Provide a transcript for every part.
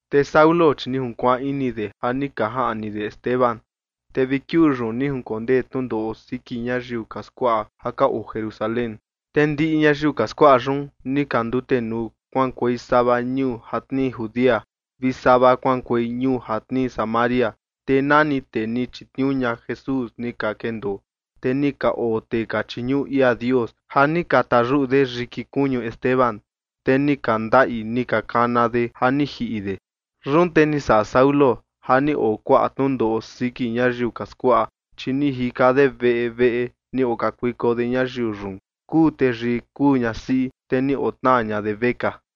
Te Saulo, chi ni junkuaan ini de ja ni ka jaꞌni de Esteban. Te vi kiuu yun ni jinkondee tnundoꞌo siki ñayiu ka skuaꞌa ja ka oo Jerusalén. Te ndiꞌi ñayiu ka skuaꞌa yun ni ka ndutenuu kuaꞌankuei sava ñuu ja tnii Judea, vi sava kuaꞌankuei ñuu ja tnii Samaria, te nani tee ni chitniuu ña Jesús ni ka kendoo. Te ni ka oo tee ka chiñuꞌu ia Dios ja ni ka tayuꞌu de yiki kuñu Esteban, te ni ka ndaꞌi ni ka kana de ja ni jiꞌi de. Yun te ni saꞌa Saulo ja ni oo kuaꞌa tnundoꞌo siki ñayiu ka skuaꞌa, chi ni jika de veꞌe veꞌe, ni okakuiko de ñayiu yun, kuu teyii kuu ñasiꞌi, te ni otnaa ña de vekaa.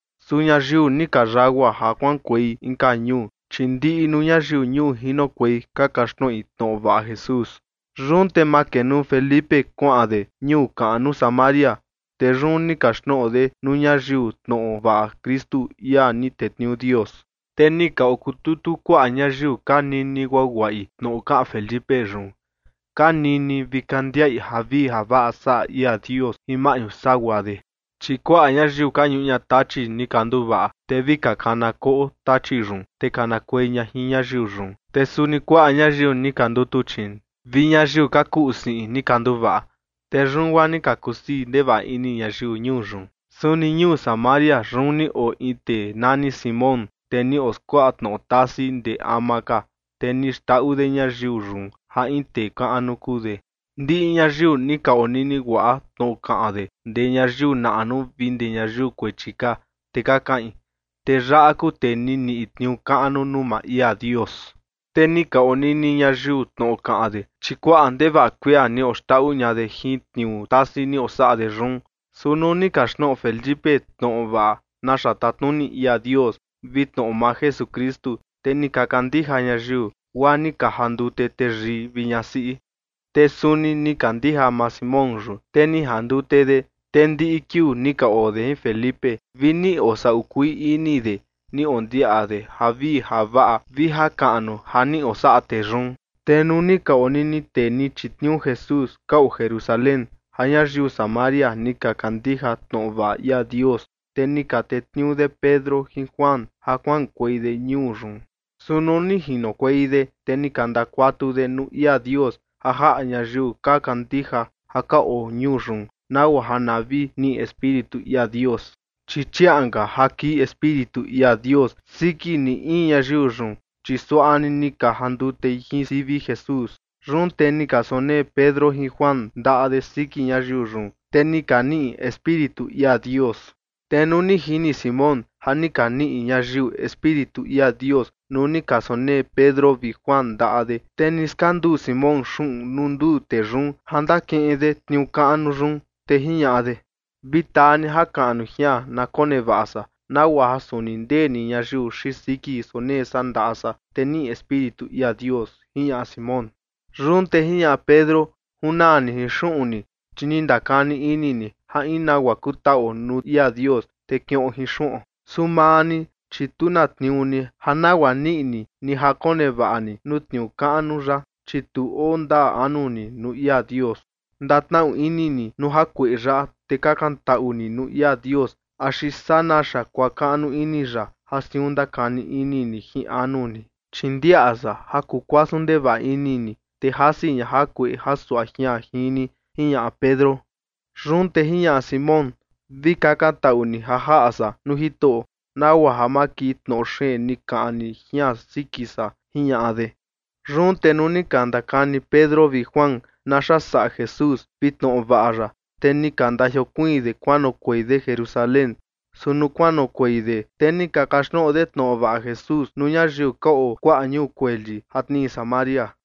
Su ñayiu ni ka yagua ja kuaꞌankuei inka ñuu, chi ndiꞌi nuu ñayiu ñuu jinokuei ka kaxtnoꞌi tnoꞌo vaꞌa Jesús. Yun te makenuu Felipe kuaꞌan de ñuu kaꞌnu Samaria, te yun ni kaxtnoꞌo de nuu ñayiu tnoꞌo vaꞌa Kristu, ia ni tetniuu Dios. Te ni ka okututu kuaꞌa ñayiu ka nini guaguaꞌi tnoꞌo kaꞌan Felipe yun, ka nini vi ka ndiaꞌi javii javaꞌa saꞌa ia Dios jin maꞌñu sagua de. Chi kuaꞌa ñayiu ka ñuꞌu ña tachi ni ka nduvaꞌa, te vi ka kana koꞌo tachi yun, te kanakuei ña jin ñayiu yun. Te suni kuaꞌa ñayiu ni ka ndutuchiin vi ñayiu ka kuꞌu siꞌin ni ka nduvaꞌa. Te yun guaa ni ka kusii ndevaꞌa ini ñayiu ñuu yun. Suni ñuu Samaria yun ni oo in tee nani Simón, tee ni oskuaꞌa tnoꞌo tasi ndee ama ka, te ni xndaꞌu de ñayiu yun ja in tee kaꞌnu kuu de. Ndiꞌi ñayiu ni ka onini guaꞌa tnoꞌo kaꞌan de ndee ñayiu naꞌnu vi ndee ñayiu kuechi ka, te ka kaꞌin: ―Tee yaꞌa kuu tee ni niꞌi tniuu kaꞌnu nuu maa ia Dios. Te ni ka onini ñayiu tnoꞌo kaꞌan de, chi kuaꞌa ndevaꞌa kuia ni oxndaꞌu ña de jin tniuu tasi ni osaꞌa de yun. Su nuu ni kaxtnoꞌo Felipe tnoꞌo vaꞌa naxa tatnuni ia Dios, vi tnoꞌo maa Jesukristu, te ni ka kandija ñayiu, guaa ni ka jandute teyii vi ñasiꞌi. Te suni ni kandija maa Simón yun, te ni jandute de, te ndiꞌi kiuu ni ka oo de jin Felipe, vi ni osaꞌu kuii ini de ni ondiaꞌa de javii javaꞌa vi jakaꞌnu ja ni osaꞌa tee yun. Te nuu ni ka onini tee ni chitniuu Jesús ka oo Jerusalén ja ñayiu Samaria ni ka kandija tnoꞌo vaꞌa ia Dios, te ni ka tetniuu de Pedro jin Juan ja kuaꞌankuei de ñuu yun. Su nuu ni jinokuei de, te ni ka ndakuatu de nuu ia Dios ja jaꞌa ñayiu ka kandija ja ka oo ñuu yun, nagua ja na vi niꞌi Espíritu ia Dios. Chi chiaꞌan ka ja kii Espíritu ia Dios siki ni in ñayiu yun, chi suaꞌa ni ni ka jandutei jin sivi Jesús. Yun te ni ka sonee Pedro jin Juan ndaꞌa de siki ñayiu yun, te ni ka niꞌi Espíritu ia Dios. Te nuu ni jini Simón ja ni ka niꞌi ñayiu Espíritu ia Dios nuu ni ka sonee Pedro vi Juan ndaꞌa de, te ni skanduu Simón xuꞌun nuu nduu tee yun ja ndakiꞌin de tniuu kaꞌnu yun. Te jiñaꞌa de: ―Vi taa ni jakaꞌnu jian na konevaꞌa san, nagua ja suni ndee ni ñayiu xiin siki sonee san ndaꞌa san, te niꞌi Espíritu ia Dios ―jiñaꞌa Simón. Yun te jiñaꞌa Pedro: ―Junaa ni jin xuꞌun ni, chi ni ndakani ini ni ja in nagua kutaꞌuo nuu ia Dios, te kiꞌon jin xuꞌon. Su maa ni, chi tu na tniuu ni ja nagua niꞌi ni, ni ja konevaꞌa ni nuu tniuu kaꞌnu yaꞌa, chi tu oo ndaa anu ni nuu ia Dios. Ndatnaꞌu ini ni nuu jakueꞌe yaꞌa, te kakantaꞌu ni nuu ia Dios axi saa naxa kuakaꞌnu ini ya ja siun ndakani ini ni jin anu ni. Chi ndiaꞌa san ja kukuasun ndevaꞌa ini ni, te jasi ña jakueꞌe jasuaꞌa jian jin ni ―jiñaꞌa Pedro. Yun te jiñaꞌa Simón: ―Vi kakantaꞌu ni ja jaꞌa san nuu Jitoꞌo, nagua ja ma kii tnoꞌo xeen ni kaꞌan ni jian siki san ―jiñaꞌa de. Yun te nuu ni ka ndakani Pedro vi Juan naxa saꞌa Jesús vi tnoꞌo vaꞌa ya, te ni ka ndajiokuiin de kuanoꞌokuei de Jerusalén. Su nuu kuanoꞌokuei de, te ni ka kaxtnoꞌo de tnoꞌo vaꞌa Jesús nuu ñayiu ka oo kuaꞌa ñuu kueli ja tnii Samaria.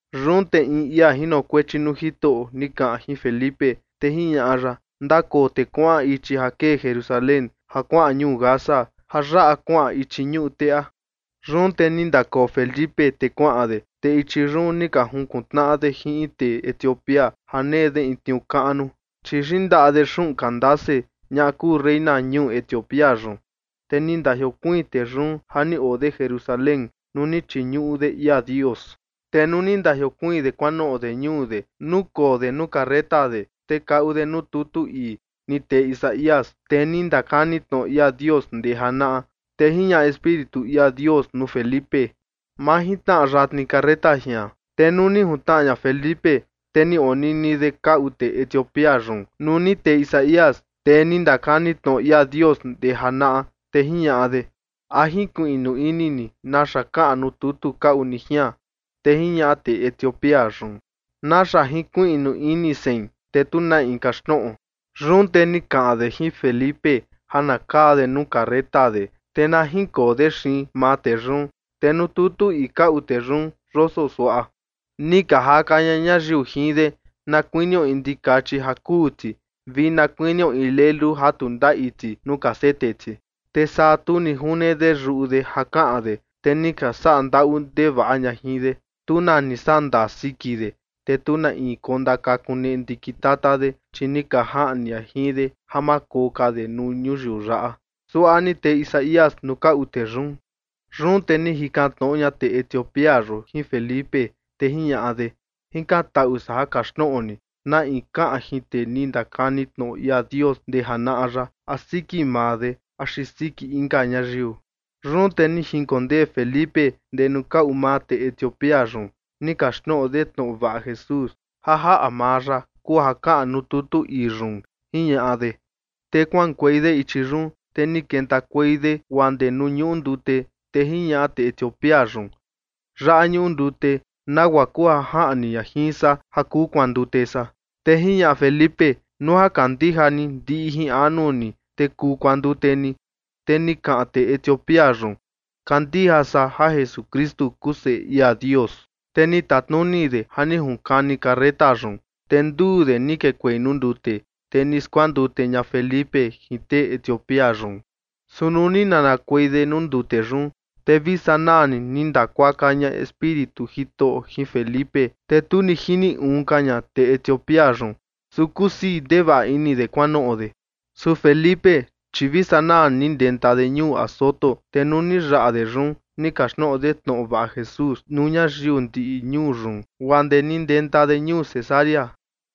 Yun te in ia jinokuechi nuu Jitoꞌo ni kaꞌan jin Felipe, te jiñaꞌa ya: ―Ndakoo te kuaꞌan ichi ja kee Jerusalén ja kuaꞌan ñuu Gaza, ja yaꞌa kuaꞌan ichi ñuꞌu teꞌa. Yun te ni ndakoo Felipe te kuaꞌan de, te ichi yun ni ka junkuntnaꞌa de jin in tee Etiopía ja nee de in tniuu kaꞌnu, chi yindaꞌa de xuꞌun Candace, ñaꞌa kuu reina ñuu Etiopía yun, te ni ndajiokuiin tee yun ja ni oo de Jerusalén nuu ni chiñuꞌu de ia Dios. Te nuu ni ndajiokuiin de kuanoꞌo de ñuu de nukoo de nuu carreta de, te kaꞌu de nuu tutu ii ni tee Isaías, tee ni ndakani tnoꞌo ia Dios ndee janaꞌa. Te jiñaꞌa Espíritu ia Dios nuu Felipe: ―Majintnaꞌa yatni carreta jian. Te nuu ni juntnaꞌa ña Felipe, te ni onini de kaꞌu tee Etiopía yun nuu ni tee Isaías, tee ni ndakani tnoꞌo ia Dios ndee janaꞌa, te jiñaꞌa de: ―¿A jinkuiꞌnu ini ni naxa kaꞌan nuu tutu kaꞌu ni jian? Te jiñaꞌa tee Etiopía yun: ―¿Naxa jinkuiꞌnu ini sein, te tu na in kaxtnoꞌo? Yun te ni kaꞌan de jin Felipe ja na kaa de nuu carreta de, te na jinkoo de xiin maa tee yun. Te nuu tutu ii kaꞌu de yun yoso suaꞌa: Ni ka jaka ña ñayiu jin de na kuinio in ndikachi ja kuu ti, vi na kuinio in lelu ja tu ndaꞌi ti nuu ka sete ti. Te saa tu ni june de yuꞌu de ja kaꞌan de. Te ni ka saꞌa ndaꞌu ndevaꞌa ña jin de. Tu na ni saꞌa ndaa siki de. Te tu na in kondakakuneꞌe ndikin tata de, chi ni ka jaꞌni ña jin de ja ma koo ka de nuu ñuyiu yaꞌa, suaꞌa ni tee Isaías nuu kaꞌu tee yun. Yun te ni jikan tnoꞌo ña tee Etiopía yun jin Felipe, te jiñaꞌa de: ―Jikantaꞌu san ja kaxtnoꞌo ni: ¿Na in kaꞌan jin tee ni ndakani tnoꞌo ia Dios ndee janaꞌa yaꞌa, a siki maa de axi siki inka ñayiu? Yun te ni jinkondee Felipe ndee nuu kaꞌu maa tee Etiopía yun, ni kaxtnoꞌo de tnoꞌo vaꞌa Jesús, ja jaꞌa maa ya kuu ja kaꞌan nuu tutu ii yun, jiñaꞌa de. Te kuaꞌankuei de ichi yun, te ni kentakuei de guaa ndee nuu ñuꞌu ndute, te jiñaꞌa tee Etiopía yun: ―Yaꞌa ñuꞌu ndute. ¿Nagua kuu ja jaꞌni ña jin san ja kuu kuandute san? Te jiñaꞌa Felipe: ―Nuu ja kandija ni ndiꞌi ni jin anu ni, te kuu kuandute ni. Te ni kaꞌan tee Etiopía yun: ―Kandija san ja Jesukristu kuu Seꞌe ia Dios. Te ni tatnuni de ja ni ka junkani carreta yun. Te nduu de ni kekuei nuu ndute, te ni skuandute ña Felipe jin tee Etiopía yun. Su nuu ni nanakuei de nuu ndute yun, te vi sanaa ni ni ndakuaka ña Espíritu Jitoꞌo jin Felipe, te tu ni jini uun ka ña tee Etiopía yun. Su kusii ndevaꞌa ini de kuanoꞌo de. Su Felipe, chi vi sanaa ni ni ndenta de ñuu Azoto. Te nuu ni yaꞌa de yun, ni kaxtnoꞌo de tnoꞌo vaꞌa Jesús nuu ñayiu ndiꞌi ñuu yun guaa ndee ni ndenta de ñuu Cesarea.